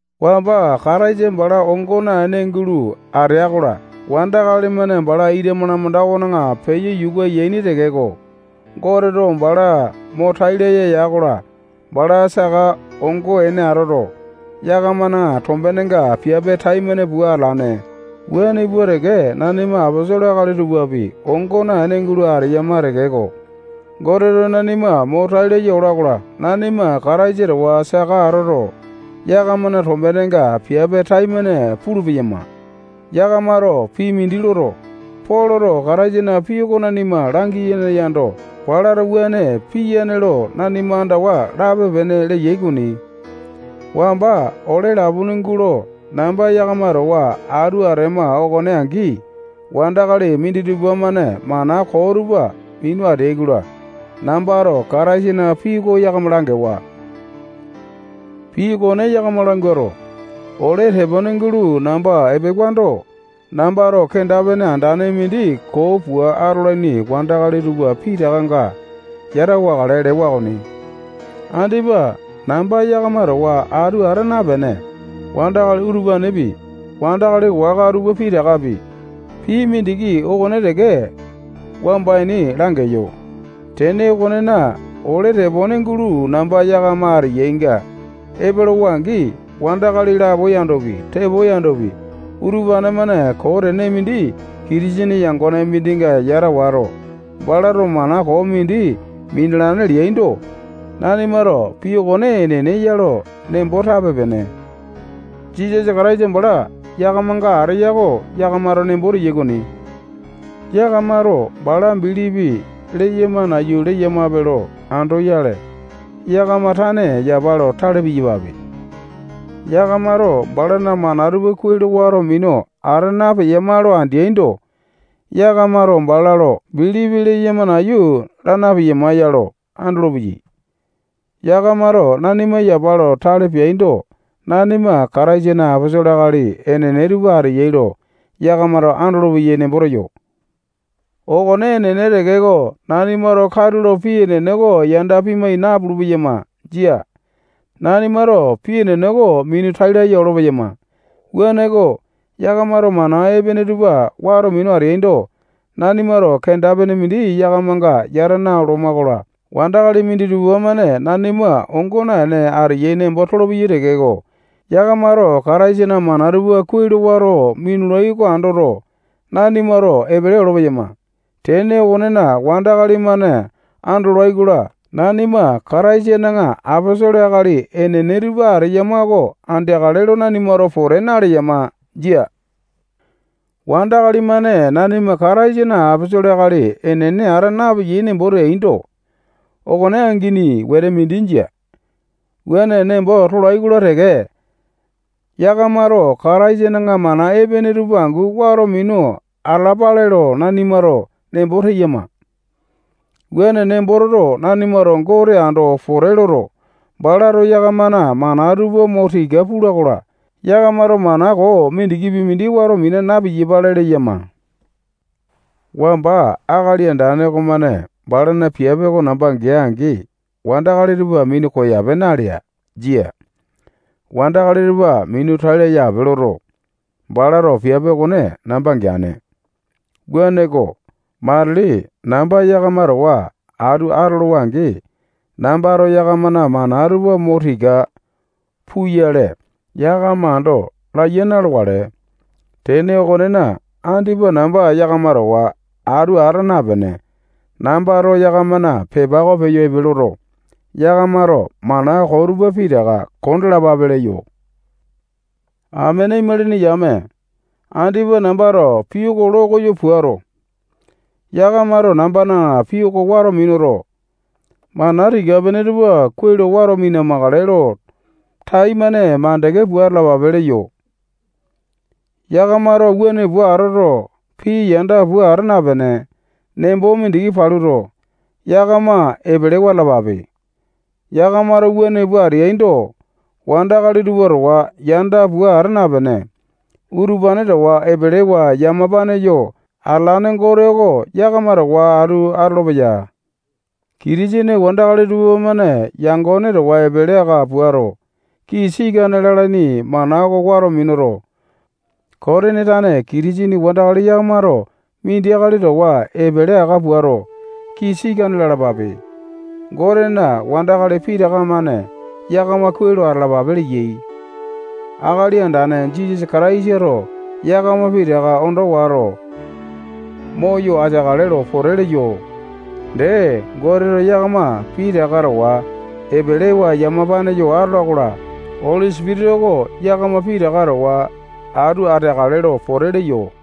Wamba Kataisa bala ongo naene gulo atea-kola, wandakali-mane bala ita malamanda okona peyo yuka yaini tekeko, Goteto bala mo tai laya ya-kola, bala saka ongo ene atoto, yakamana tombenenga piape taimane pua atalane. Wuane pua teke, nanima aposolo akali tupapi ongo naene gulo ateyama tekeko, Goteto nanima mo tai laya ola-kola, nanima Kataisa towa saka atoto, yakamana tombenenga piape taimane pulu-peyama. Yakamato pii mindi loto, Poloto Kataisana pii oko nanima langiyane yando, balato wuane piyane lo nanima andawa lape-pene leyai okoni. Wamba ole lapone gulo namba yakama towa atu atema okone angi, wandakali minditupa-mane mana koo tupa minu ateai-kola, nambato Kataisana pii oko yakama langewa. Pii okone yakama languato, ole tepone gulo namba epewando, nambato kenda-pene andane mindi koo pua atolaini wandakali tupa pitakanga yata wakale lewa okoni. Andipa namba yakama towa atu ata napene, wandakali utupanepi, wandakali waka tupa pitakapi, pii mindiki okone teke wamba ini langeyo. Tene okonena, ole tepone gulo namba yakama ateyainga epolowa-angi, wandakali lapo yandopi, tepo yandopi, utupane-mane koo tene mindi Kitisene yangone mindinga yata wato, balato mana koo mindi minalane leaindo, nanimato pii okone enene ya lo nembo tape-pene. Jisasa Kataisa bala yakamanga ateya oko yakamato nembo teyai okoni. Yakamato bala bilipi leyama nayu leyamape lo andoyale, yakama tane yapa lo tale piyapape. Yakamato balana mana tupa kuai lo wato minu ata napeyama lo andeaindo, yakamato bala lo bilipi leyama nayu laa na-piyama ya lo andolopeyai. Yakamato nanima yapa lo tale peaindo, nanima Kataisana aposolo akali enene tupa ateyai lo yakamato andolopeyai nembo teyo. Okone enene tekeko, nanimato katulo pii enene oko yanda pimai napulu-peyama. Jia. Nanimato pii enene oko minu tai laya olo-peyama. Wuaneko, yakamato mana epene tupa wato minu ateaindo, nanimato kenda-pene mindi yakamanga yata naoloma-kola, wandakali minditupa-mane nanima ongo naene ateyai nembo tolopeyai tekeko, yakamato Kataisana mana tupa kuai lo wato minulai oko andoto, nanimato epele olo-peyama. Tene okonena, wandakali-mane andolai-kola, nanima Kataisana aposolo akali enene tupa ateyama oko andeakale lo nanimato pote naleyama. Jia. Wandakali-mane nanima Kataisana aposolo akali enene ata napeyai nembo teaindo, okone angini wete mindi jia. Wuane nembo tolai-kola teke, yakamato Kataisana mana epene tupa angu wato minu atalapale lo nanimato nembo teyama. Wuane nembo toto, nanimato Gote ando pote loto, balato yakamana mana tupa mo tika pula-kola, yakamato mana koo mindikipi mindi wato mina na-piyapale leyama. Wamba Akali Andane okomane balana piape oko namba gea-angi, wandakali tupa minu koyape nalea. Jia. Wandakali tupa minu tai laya ape loto, balato piape okone namba geane. Wuaneko, matili namba yakama towa atu atolowa-angi, nambato yakamana mana tupa mo tika puyale, yakama ando laiya na-lokale. Tene okonena, andipa namba yakama towa atu ata napene, nambato yakamana pepa oko peyo epe loto, yakamato mana koo tupa pitaka kondalapape leyo. Amene imalini yame, andipa nambato pii oko lo koyo puato, yakamato nambana pii oko wato minuto, mana tika-pene tupa kuai lo wato mina-makale lo taimane makande pua atalapape leyo. Yakamato wuane pua atoto, pii yanda pua ata napene, nembo mindiki paluto, yakama epelewa atalapape. Yakamato wuane pua ateaindo, wandakali tupa towa yanda pua ata napene, utupane towa epelewa yamapane yo atalane Gote oko yakama towa atu atolopeya. Kitisene wandakali tupamane yangone towa epele aka puato, kii sikane lalaini mana oko wato minuto, Kotini tane Kitisene wandakali yakamato mindi akali towa epele aka puato, kii sikane lalapape. Gotena wandakali pitaka-mane yakama kuai lo atalapape leyai. Akali Andane Jisasa Kataisato yakama pitaka ondo wato, moyo ateakale lo pote leyo. Dee, Goteto yakama pitaka towa epelewa yamapane yo atola-kola, Oli Sipitisa oko yakama pitaka towa atu ateakale lo pote leyo.